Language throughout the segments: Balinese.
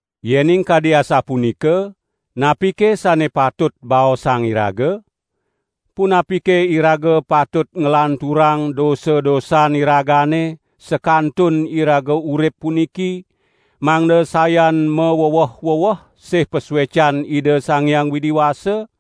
Yening kadi asapunika, napike sane patut baosang iraga? Punapike iraga patut nglanturang dosa-dosan iragane sakantun iraga urip puniki, mangda sayan maweweh-weweh sih pasuecan Ida Sang Hyang Widi Wasa?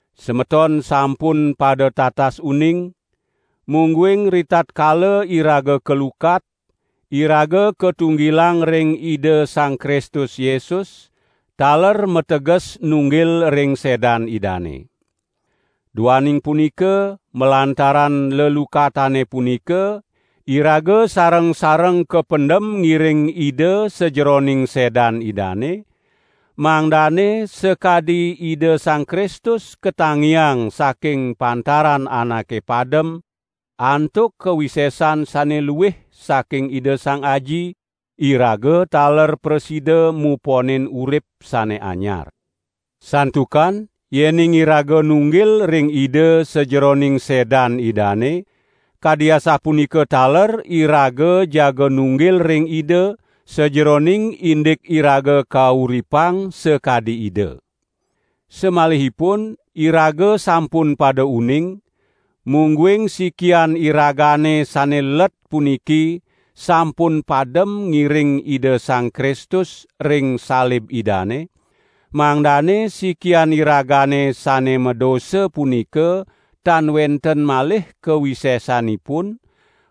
Semeton sampun pada tatas uning, mungguing ritatkala iraga kalukat, iraga katunggilang ring Ida Sang Kristus Yesus, taler mateges nunggil ring sedan Idane. Duaning punika malantaran lelukatane punika, iraga sareng-sareng kapendem ngiring Ida sajeroning sedan Idane, mangdane sakadi Ida Sang Kristus katangiang saking pantaran anake padem antuk kawisesan sane luih saking Ida Sang Aji, iraga taler prasida muponin urip sane anyar. Santukan yening iraga nunggil ring Ida sajeroning sedan Idane, kadi asapunika taler iraga jaga nunggil ring Ida sajeroning indik iraga kauripang sakadi Ida. Samalihipun iraga sampun pada uning, mungguing sikian iragane sane let puniki sampun padem ngiring Ida Sang Kristus ring salib Idane, mangdane sikian iragane sane madosa punika tan wenten malih kawisesanipun,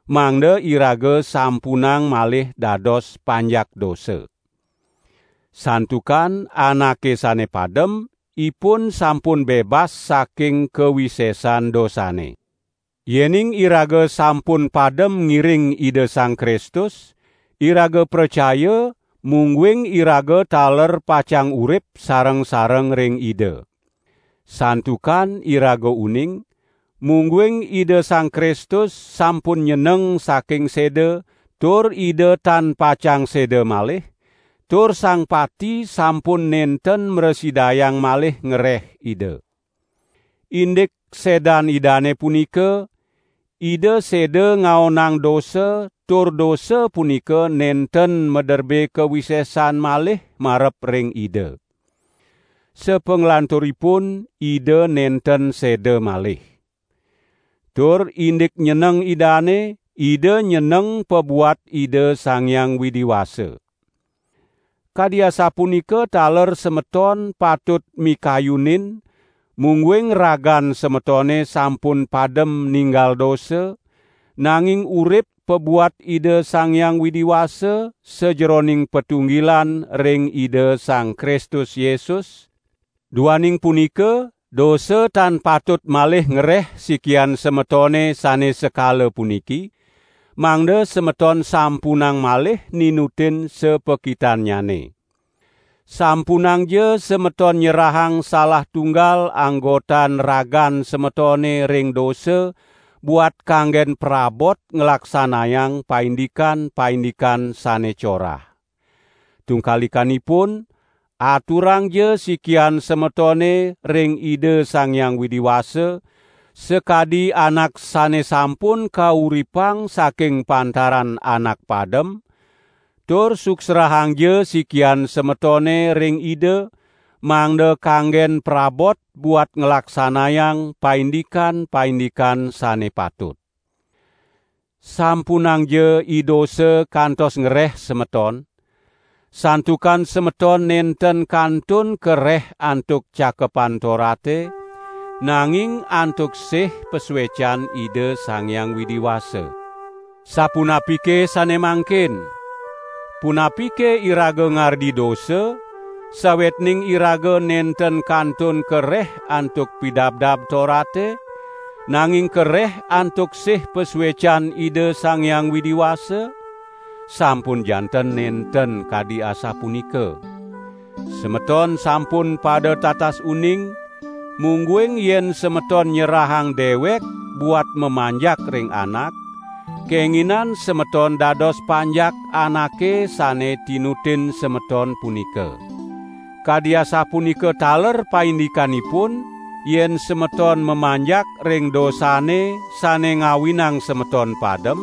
mangda iraga sampunang malih dados panjak dosa. Santukan anake sane padem, ipun sampun bebas saking kawisesan dosane. Yening iraga sampun padem ngiring Ida Sang Kristus, iraga pracaya mungguing iraga taler pacang urip sareng-sareng ring Ida. Santukan iraga uning, mungguing Ida Sang Kristus sampun nyeneng saking seda tur Ida tan pacang seda malih, tur sang pati sampun nenten mrasidayang malih ngreh Ida. Indik sedan Idane punika, Ida seda ngaonang dosa tur dosa punika nenten maderbe kawisesan malih marep ring Ida. Sapanglanturipun Ida nenten seda malih. Tur indik nyeneng Idane, Ida nyeneng pabuat Ida Sang Hyang Widi Wasa. Kadi asapunika taler semeton patut mikayunin mungguing ragan semetone sampun padem ninggal dosa, nanging urip pabuat Ida Sang Hyang Widi Wasa sajeroning patunggilan ring Ida Sang Kristus Yesus. Duaning punika, dosa tan patut malih ngreh sikian semetone sane sekala puniki, mangda semeton sampunang malih ninutin sapakitannyane. Sampunangja semeton nyerahang salah tunggal anggotan ragan semetone ring dosa buat kanggen prabot nglaksanayang paindikan-paindikan sane corah. Tungkalikanipun, aturangja sikian semetone ring Ida Sang Hyang Widi Wasa, sakadi anak sane sampun kauripang saking pantaran anak padem, tur suksrahangja sikian semetone ring Ida, mangda kanggen prabot buat nglaksanayang paindikan-paindikan sane patut. Sampunangja idosa kantos ngreh semeton; santukan semeton nenten kantun kareh antuk Cakepan Torate, nanging antuk sih pasuecan Ida Sang Hyang Widi Wasa. Sapunapike sane mangkin? Punapike iraga ngardi dosa, sawetning iraga nenten kantun kareh antuk Pidabdab Torate, nanging kareh antuk sih pasuecan Ida Sang Hyang Widi Wasa? Sampun janten nenten kadi asapunika. Semeton sampun pada tatas uning, mungguing yen semeton nyerahang dewek buat mamanjak ring anak, kenginan semeton dados panjak anake sane tinutin semeton punika. Kadi asapunika taler paindikanipun yen semeton mamanjak ring dosane sane ngawinang semeton padem,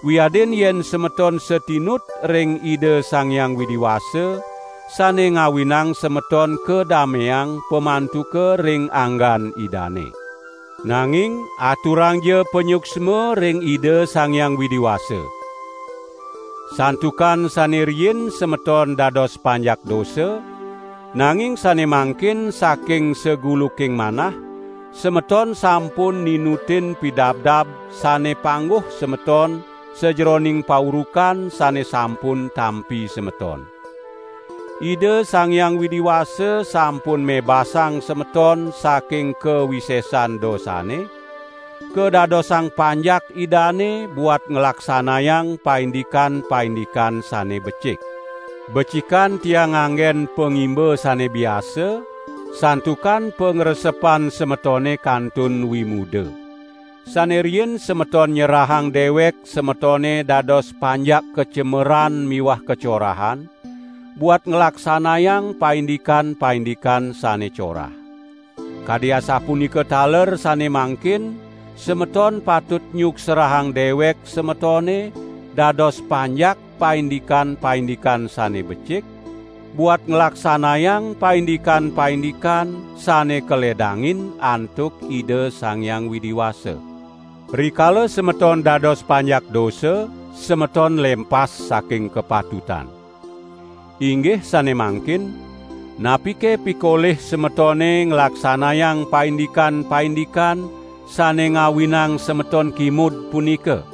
wiadin yen semeton satinut ring Ida Sang Hyang Widi Wasa, sane ngawinang semeton kadameang pamantuka ring anggan Idane. Nanging aturangja panyuksma ring Ida Sang Hyang Widi Wasa. Santukan sane riin semeton dados panjak dosa, nanging sane mangkin saking saguluking manah, semeton sampun ninutin pidabdab sane pangguh semeton sajeroning paurukan sane sampun tampi semeton. Ida Sang Hyang Widi Wasa sampun mebasang semeton saking kawisesan dosane, kadadosang panjak Idane buat nglaksanayang paindikan-paindikan sane becik. Becikan tiang nganggen pangimba sane biasa, santukan pangresepan semetone kantun wimuda. Sane riin semeton nyerahang dewek semetone dados panjak kacemeran miwah kacorahan, buat nglaksanayang paindikan-paindikan sane corah. Kadi asapunika taler sane mangkin semeton patut nyuksrahang dewek semetone dados panjak paindikan-paindikan sane becik, buat nglaksanayang paindikan-paindikan sane kaledangin antuk Ida Sang Hyang Widi Wasa. Rikala semeton dados panjak dosa, semeton lempas saking kapatutan. Inggih sane mangkin, napike pikolih semetone nglaksanayang paindikan-paindikan sane ngawinang semeton kimud punika!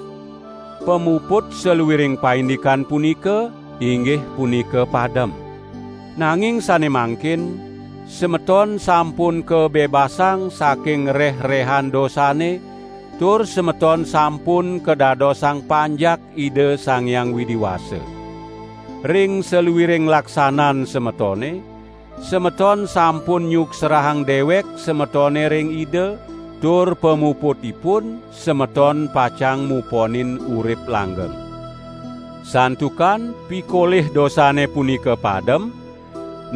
Pamuput saluiring paindikan punika, inggih punika padem. Nanging sane mangkin, semeton sampun kabebasang saking reh-rehan dosane tur semeton sampun kadadosang panjak Ida Sang Hyang Widi Wasa. Ring saluiring laksanan semetone, semeton sampun nyuksrahang dewek semetone ring Ida, tur pamuputipun semeton pacang muponin urip langgeng. Santukan pikolih dosane punika padem,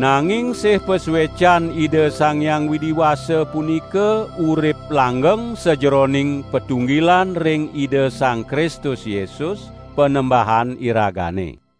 nanging sih pasuecan Ida Sang Hyang Widi Wasa punika urip langgeng sajeroning patunggilan ring Ida Sang Kristus Yesus, Panembahan iragane.